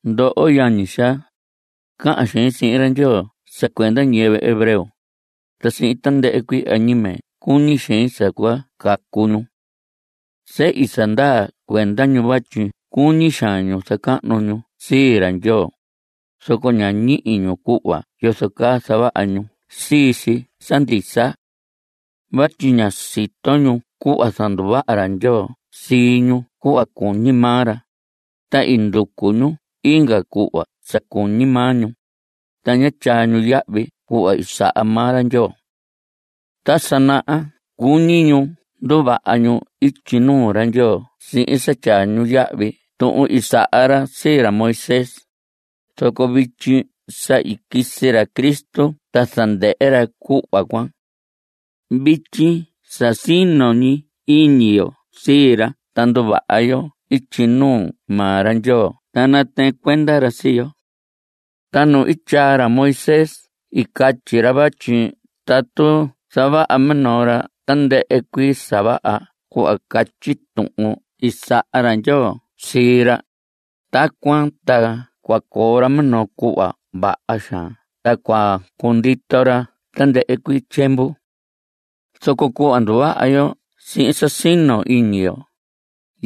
Ndoho yañi xaa, cahan xein sihin ra Ndyoo sa cuenda ñiyɨvɨ hebreo, ta sihin tandɨhɨ cuii añime cuñi xein sa cua cacu ñu. Sehi sa ndaa cuenda ñu vatyi cuñi xaan ñu zacahnu ñu sii ra Ndyoo, zoco ña ñihi ñu cuhva yozo caa zavaha ñu sii si sa ndisa. Vatyi ña sito ñu cuhva zanduvaha ra Ndyoo sii ñu cuhva cuñi maa ra, ta i nducu ñu inga cuhva sa cuñi maa ñu, ta ña tyaa ñu yahvi cuhva i saha maa ra Ndyoo. Ta sa naha cuñi ñu nduvaha ñu ityi nuu ra Ndyoo sihin sa tyaa ñu yahvi tuhun i saha ra sii ra Moisés. Zoco vityi sa i quisi ra Cristo ta zandɨhɨ ra cuhva cuan. Vityi sa sino ñi iñi yo sii ra ta nduvaha yo ityi nuu maa ra Ndyoo ta natɨɨn cuenda ra sii yo. Ta nu i tyaa ra Moisés i catyi ra vatyi tatu zavaha minoo ra tandɨhɨ cuii sa vaha cuhva catyi tuhun i saha ra Ndyoo sii ra, tacuan ta cua coo ra minoo cuhva vaha xaan ta cua cundito ra tandɨhɨ cuii tyiemvu. Zoco cuhva nduvaha yo sihin sa sino iñi yo,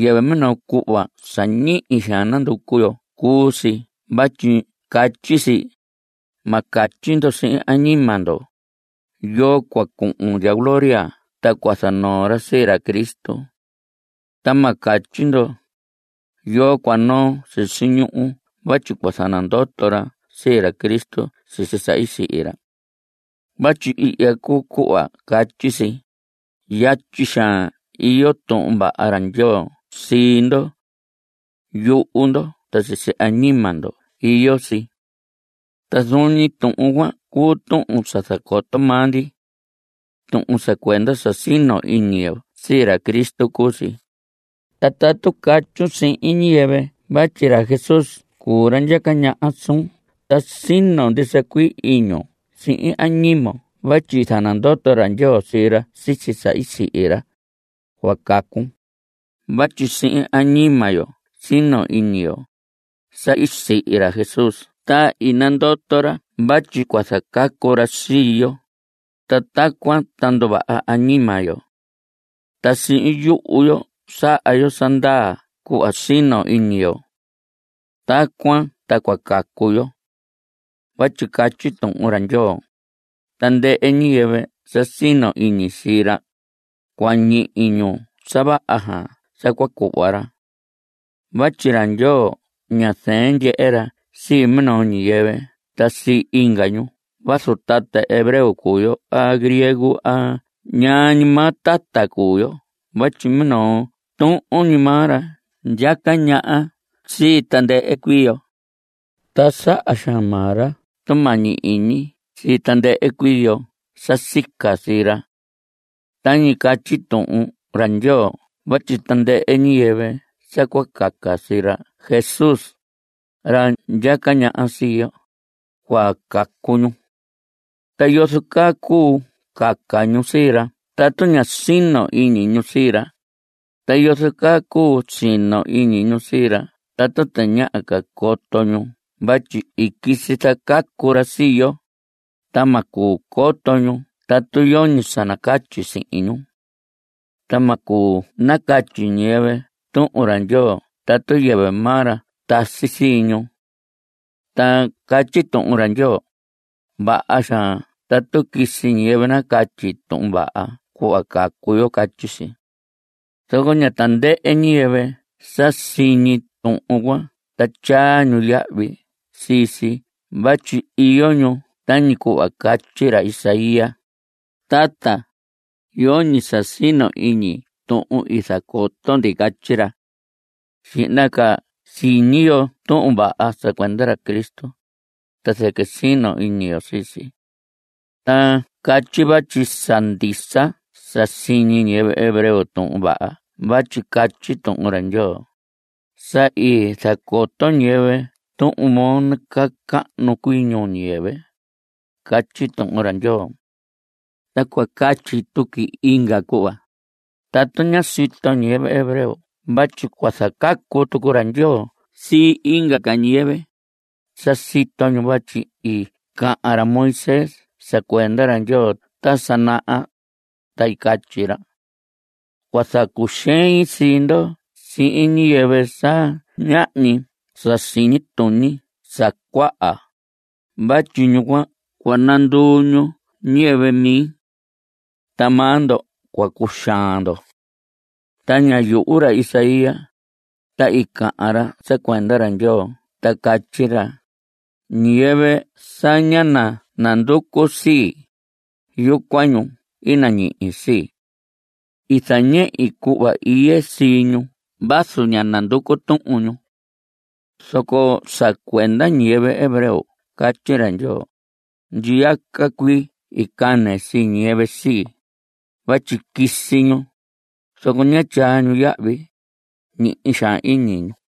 yɨvɨ minoo cuhva sa ñihi xaan nanducu yo cuu si vatyi catyi si: “Ma catyi ndo sihin añima ndo: ¿Yoo cua cuhun ndya gloria ta cua zanoo ra sii ra Cristo? Ta ma catyi ndo: ¿Yoo cua noo sisi ñuhu vatyi cua zanandoto ra sii ra Cristo sisi sa i sihi ra?” Vatyi ihya cuu cuhva catyi si: “Yatyi xaan iyo tuhun vaha ra Ndyoo sii ndo. Yuhu ndo ta sisi añima ndo iyo si.” Ta zuun ñi tuhun cuan cuu tuhun sa zacoto maa ndi. Tuhun sa cuenda sa sino iñi yo sii ra Cristo cuu si. Ta tatu catyun sihin ñiyɨvɨ vatyi ra Jesús cuu ra ndyaca ñaha suun ta sino ndisa iñun sihin añimon vatyi i zanandoto ra Ndyoo sii ra sisi sa i sihi ra, cua cacun. Vatyi sihin añima yo sino iñi yo (sa i sihi ra Jesús ta i nandoto ra vatyi cua zacacu ra sii yo), ta tacuan ta nduvaha añima yo. Ta sihin yuhu yo saha yo sa ndaa cuhva sino iñi yo. Tacuan ta cua cacu yo. Vatyi catyi Tuhun ra Ndyoo: “Tandɨhɨ ñiyɨvɨ sa sino iñi sii ra, cua ñihi ñu sa vaha xaan sa cua cuhva ra.” Vatyi ra Ndyoo ña zɨɨn ndyehe ra sii minoo ñiyɨvɨ ta sii inga ñu vazu tata hebreo cuu yo a griego a ñaa ñi maa tata cuu yo vatyi minoo tuhun ñi maa ra ndyaca ñaha sii tandɨhɨ cuii yo. Ta saha xaan maa ra tumañi iñi sii tandɨhɨ cuii yo sa sica sii ra. Tañi catyi Tuhun ra Ndyoo vatyi tandɨhɨ ñiyɨvɨ sa cua caca sii ra Jesús, ra ndyaca ñaha sii yo, cua cacu ñu. ¿Ta yozo caa cuu caca ñu sii ra tatu ña sino iñi ñu sii ra? ¿Ta yozo caa cuu sino iñi ñu sii ra tatu tañaha ca coto ñu vatyi i quisi zacacu ra sii yo? Ta ma cuu coto ñu tatu yoñi sa nacatyi sihin ñu. Ta ma cuu nacatyi ñiyɨvɨ Tuhun ra Ndyoo tatu yɨvɨ maa ra tasi sii ñu. Ta catyi Tuhun ra Ndyoo: “Vaha xaan tatu quisi ñiyɨvɨ nacatyi tuhun vaha cuhva cacu yo”, catyi si. Zoco ña tandɨhɨ ñiyɨvɨ sa siñi tuhun cuan ta tyaa ñu yahvi sii si vatyi iyo ñu tañi cuhva catyi ra Isaías: “Tata, yoñi sa sino iñi tuhun i zacoto ndi”, catyi ra. Xihna ca siñi yo tuhun vaha sa cuenda ra Cristo, ta zɨquɨ sino iñi yo sii si. Ta catyi vatyi sa ndisa sa siñi ñiyɨvɨ hebreo tuhun vaha vatyi catyi Tuhun ra Ndyoo: Sa i zacoto ñiyɨvɨ Tuhun moo nacahnu cuii ñuu ñiyɨvɨ, catyi Tuhun ra Ndyoo. Ta cua catyi tuqui inga cuhva: ¿Atu ñá sito ñiyɨvɨ hebreo vatyi cua zacacu tucu ra Ndyoo sii inga ca ñiyɨvɨ? Sa i sito ñu vatyi i cahan ra Moisés sa cuenda ra Ndyoo ta sa naha, ta i catyi ra: Cua zacuxein sii ndo sihin ñiyɨvɨ sa ñahñi sa siñi tuñi sa cuaha, Vatyi ñu cuan cua nanduu ñu ñiyɨvɨ mi. Ta maa ndo cua cuxaan ndo. Ta ñá yuhu ra Isaías, ta i cahan ra sa cuenda ra Ndyoo ta catyi ra: Ñiyɨvɨ sa ñá nanducu sii, yucuan ñu i nañihi sii. I zañehi cuhva iye sii ñu vazu ñá nducu tuhun ñu. Zoco sa cuenda ñiyɨvɨ hebreo catyi ra Ndyoo: “Ndyiyaca cuii i cane sii ñiyɨvɨ sii, vatyi quisi ñu, zoco ñá tyaa ñu yahvi. Ñihi xaan iñi ñu.”